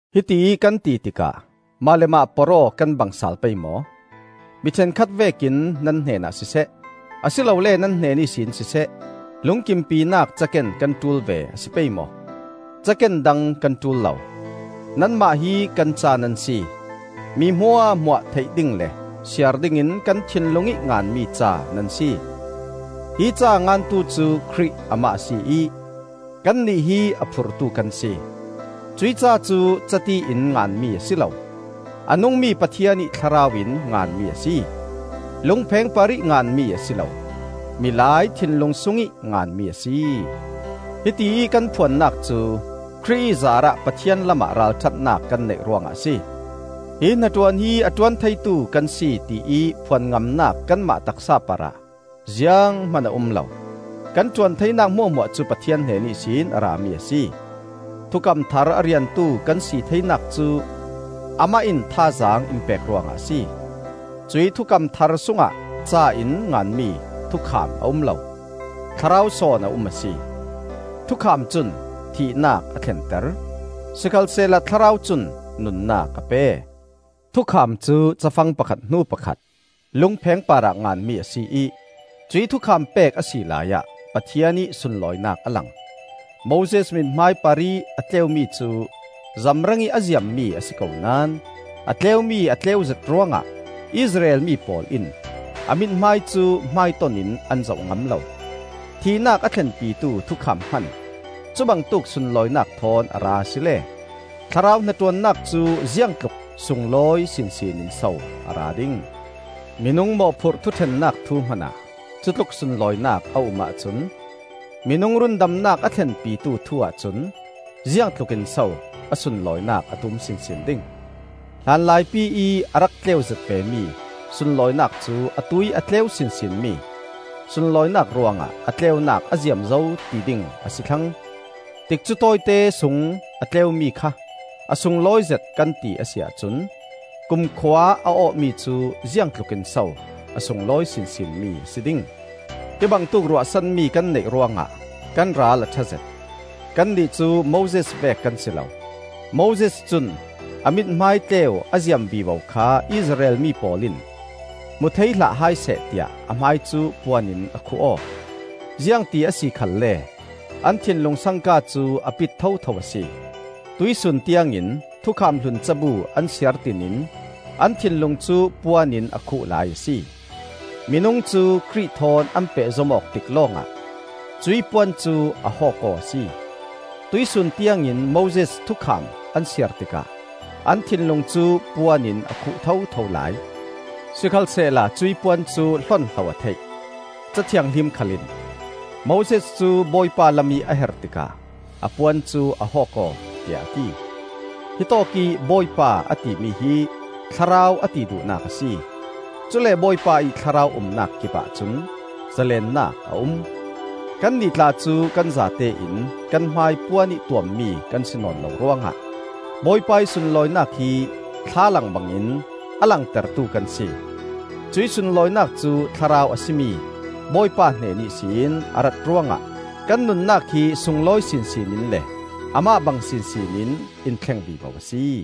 Hitiih kan ti tikah mah le mah porh-aw kan bang sal pei maw? Mi ṭhenkhat vekin nan hnenah siseh, a si lole nan hnen ihsin siseh, lungkimpinak caken kan ṭul ve a si pei maw? Caken dang kan ṭul lo, nanmah hi kan ca nan si; mi hmuahhmuah theih ding le siar dingin kan thinlung ih nganmi ca nan si. Hi ca a ngantu cu Khrih amah a si ih kannih hi a phurtu kan si. Cuih ca cu cati in nganmi a si lo, a nungmi Pathian ih Thlarau in nganmi a si; lungpheng parih nganmi a si lo, milai thinlung sungih nganmi a si. Hitiih kan phuannak cu Khrih ih zaarah Pathian lamah ralṭhatnak kan neih ruangah a si. Hi hnaṭuan hi a ṭuan theitu kan si tiih phuan ngamnak kanmah taksa parah zianghman a um lo. Kan ṭuan theinak hmuahhmuah cu Pathian hnen ihsin a rami a si. Thukam thar a riantu kan si theinak cu Amah in thazaang in pek ruangah a si. Cuih thukam thar sungah ca in nganmi Thukham a um lo; Thlarau sawn a um a si. Thukham cun thihnak a thlenter, sikhalsehla Thlarau cun nunnak a pe. Thukham cu cafang pakhat hnu pakhat lungpheng parah nganmi a si ih cuih thukham pek a si laiah Pathian ih sunlawinak a lang. Moses mithmai parih a tleumi cu zamrangih a ziammi a si ko naón a tleumi a tleuzet ruangah Israel mi pawl in a mithmai cu hmaiton in an zoh ngam lo. Thihnak a thlenpitu thukham hman cubangtuk sunlawinak thawn a ra asile, Thlarau hnaṭuannak cu ziangtluk sunglawi sinsin in so a ra ding? Minung mawhphurh thuṭhennak thu hmanah cutluk sunlawinak a um ahcun, minung rundamnak a thlenpitu thu-ah cun ziangtluk in so a sunlawinak a tum sinsin ding? Hlanlaipi ih a rak tleuzet vemi sunlawinak cu atuih a tleu sinsinmi sunlawinak ruangah a tleunak a ziam zo ti ding a si thlang. Tikcu tawite sung a tleumi kha a sunglawizet kan ti a si ahcun kumkhua a awhmi cu ziangtlukin so a sunglawi sinsinmi a si ding? Hi bangtuk ruahsanmi kan neih ruangah kan ral a ṭhazet. Kannih cu Moses vek kan si lo. Moses cun a mithmai tleu a ziam vivo kha Israel mi pawl in hmu thei hlah hai seh tiah a hmai cu puan in a khuh aw. Ziangti a si khalle an thinlung sangka cu a pit thotho a si. Tuihsun tiangin thukham hlun cabu an siar tinin an thinlung cu puan in a khuh lai a si. Minung cu Khrih thawn an pehzom awk tik lawngah cuih puan cu a hawk aw a si. Tuihsun tiangin Moses Thukham an siar tikah an thinlung cu puan in a khuh thotho lai. Sikhalsehla cuih puan cu hlonhlo a theih; Ca Thianghlim khal in, “Moses cu Bawipa lamih a her tikah a puan cu a hawk aw,” tiah a ti. Hitawk ih, “Bawipa,” a timi hi Thlarau a ti duhnak a si. Cule Bawipa ih Thlarau umnak kipah cun zalennak a um. Kannih tla cu kan zatein kan hmai puanih tuammi kan si nawn lo ruangah Bawipa ih sunlawinak hi thlalang bangin a langtertu kan si. Cuih sunlawinak cu Thlarau a si mi Bawipa hnen ihsin a rat ruangah kan nunnak hi sunglawi sinsin in le Amah bang sinsin in in thleng vivo a si.